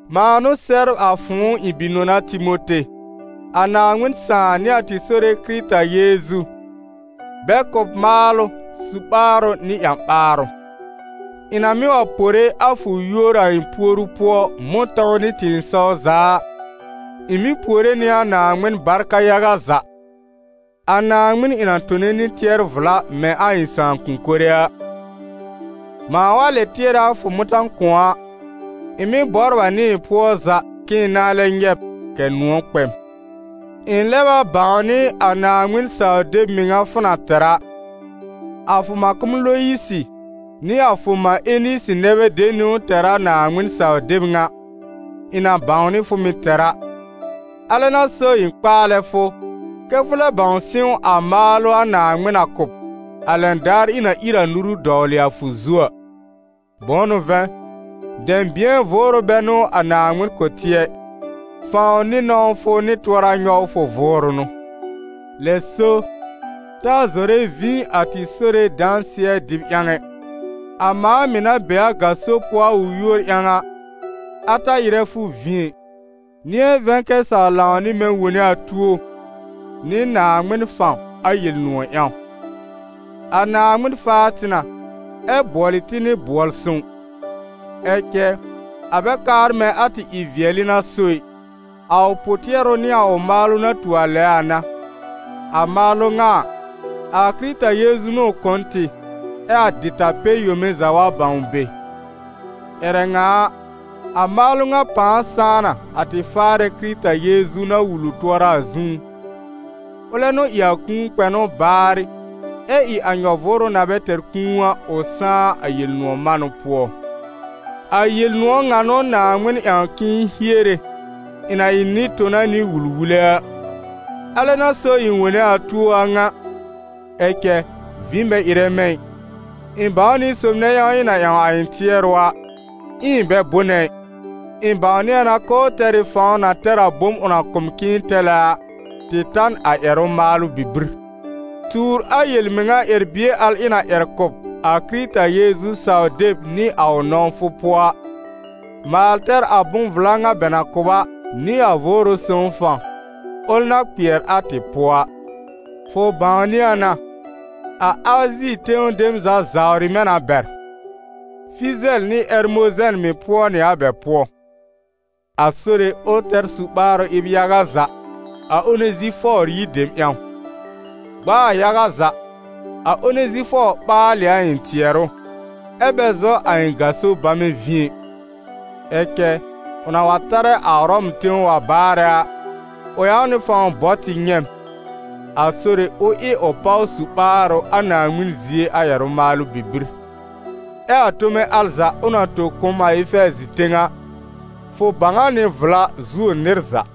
mãa n'ʋ sɛbr a fʋ̃ʋ ɩ̃ bi-nɔna Timote. A Naaŋmɩn Sãà nɩ a tɩ Sore Kɩrɩta Yeezu, bɛ kʋ̀ b maalʋ, su-ɓaarʋ nɩ ƴã-ɓaarʋ. Ɩ̃ na mɩ́ wa pore a fʋ yúor a ɩ̃ puoru pʋɔ, mʋ̃tɔ̃w nɩ tɩ̃ɩsɔw za a, ɩ̃ mɩ́ puore nɩ a Naaŋmɩn barka yaga za, a Naaŋmɩn ɩ̃ na tone nɩ tɩɛr-vla mɛ̃ a ɩ̃ sãakʋ̃-kore a. Mãa wa lɛ tɩɛrɛ a fʋ mʋ̃ta-kʋ̃ɔ a, ɩ̃ mɩ́ bɔbr a nɩ ɩ̃ pʋɔ za k'ɩ̃ɩ nãá lɛb nyɛ̃ b kɛ̀ nʋ̃ɔ̀ kpɛ m. Ɩ̃ lɛb a bãwnɩ a Naaŋmɩn saw-deb mɩŋa fʋ na tɛr a. A fʋ mãkʋm Loyisɩ nɩ a fʋ mã Enisɩ nɛ bɛ de niwn tɛr a Naaŋmɩn saw-deb ŋa, ɩ̃ na bãwnɩ fʋ mɩ̀ tɛr a. Alɛ n'a so ɩ̃ kpaalɛ fʋ, kɛ́ fʋ lɛb sɩ̃w a maalʋ a Naaŋmɩn na kʋ̀ b, a lɛn daar ɩ̃ na ír a nuru dɔwlɩ a fʋ zu a. Bʋ̃ʋ n'ʋ vɛ̃, dɛ̃bɩ̃ɛ vʋʋrʋ bɛ n'ʋ a Naaŋmɩn kʋ̀ tɩ ɛ, fãw nɩ nɔ̃wfʋ nɩ tʋɔra-nyɔwfʋ vʋʋrʋ n'ʋ. Lɛ so, ta zɔrɛ vĩ a tɩ Sore dãsɩɛ dɩb ƴãw ɛ; a mãa mɩ̀ na be a gaso pʋɔ a ʋ yúor ƴãw a, a ta ɩrɛ fʋ vĩ ɛ. Nɩ̃ɛ vɛ̃ kɛ saw lãw nɩ mɛ̃ wone a tuo, nɩ Naaŋmɩn fãw, a Yel-nʋ̃ɔ̀ ƴãw. A Naaŋmɩn faa tɩ na, ɛ bʋɔlɩ tɩ nɩ bʋɔl-sõw. Ɛ cɛ a bɛ kaar mɛ̃ a tɩ ɩ-vɩɛlɩ n'a so ɩ, a ʋ pʋ-tɩɛrʋ nɩ a ʋ maalʋ na tu a lɛ a n'a. A maalʋ ŋa a, a Kɩrɩta Yeezu n'ʋ ʋ kʋ̀ n tɩ, ɛ a dɩta-pɛ-yome za wa bãw be. Ƴɛrɛ ŋa a, a maalʋ ŋa pãa sãá na, a tɩ Faarɛ Kɩrɩta Yeezu na wul ʋ tʋɔra a zũú. Ʋlɛ n'ʋ ɩ a kũu kpɛnʋ baarɩ, ɛ ɩ a nyɔ-vʋʋrʋ na bɛ tɛr kũu a, ʋ sãá a Yel-nʋ̃ɔ̀ manʋ pʋɔ. A Yel-nʋ̃ɔ̀ ŋa n'ʋ Naaŋmɩn ƴãw k'ɩ̃ɩ hiere, ɩ̃ na ɩ nɩ-tona nɩ wul-wule a. Alɛ n'a so ɩ̃ wone a tuo a ŋa. Ɛ cɛ vĩ bɛ ɩrɛ mɛ̃ ɩ, ɩ̃ bãw nɩ sob nɛ ƴãw ɩ̃ na ƴãw a ɩ̃ tɩɛrʋ a, ɛ ɩ̃ bɛ bʋnɛ ɩ, ɩ̃ bãwnɩ a na k'ʋʋ tɛr ɩ fãw na tɛr a bom ʋ na kʋ̀ m k'ɩ̃ɩ tɛlɛ a, tɩ ta a n ƴɛrʋ-maalʋ bibir. Tuur a yel-mɩŋa ƴɛr-bie al ɩ̃ na ƴɛr kʋ̀ b a Kɩrɩta Yeezu saw-deb nɩ a ʋ nɔ̃wfʋ pʋɔ a. Maal tɛr a bʋ̃-vla ŋa bɛ na kʋ̀ b a, nɩ a Vʋʋrʋ Sõw fãw, ʋl na kpɩɛr a tɩ pʋɔ a. Fʋ bãwnɩ a na, a Azi tẽw dem za zawrɩ mɛ̃ na bɛr, Fɩzɛl nɩ Ɛrmozɛn mɩ̀ pʋɔ nɩ a bɛ pʋɔ. A Sore, ʋ tɛr su-ɓaarʋ ɩb yaga za a Onezifɔɔr yir dem ƴãw. Gb'a a yaga za, a Onezifɔɔr ɓaal ɩ a ɩ̃ tɩɛrʋ, ɛ bɛ zɔ a ɩ̃ gaso bamɛ vĩ ɛ. Ɛ cɛ ʋ na wa tarɛ a Ʋrɔm tẽw wa baarɛ a, ʋ ƴãw nɩ fãw bɔ tɩ nyɛ̃ m. A Sore, ʋ ɩ ʋ páw su-ɓaarʋ a Naaŋmɩn zie a ƴɛrʋ-maalʋ bibir. Ɛ a tome al za, ʋ na tõ kʋ̀ m a Efɛɛzɩ tẽw a, fʋ bãw a nɩ vla zuo nɩr za.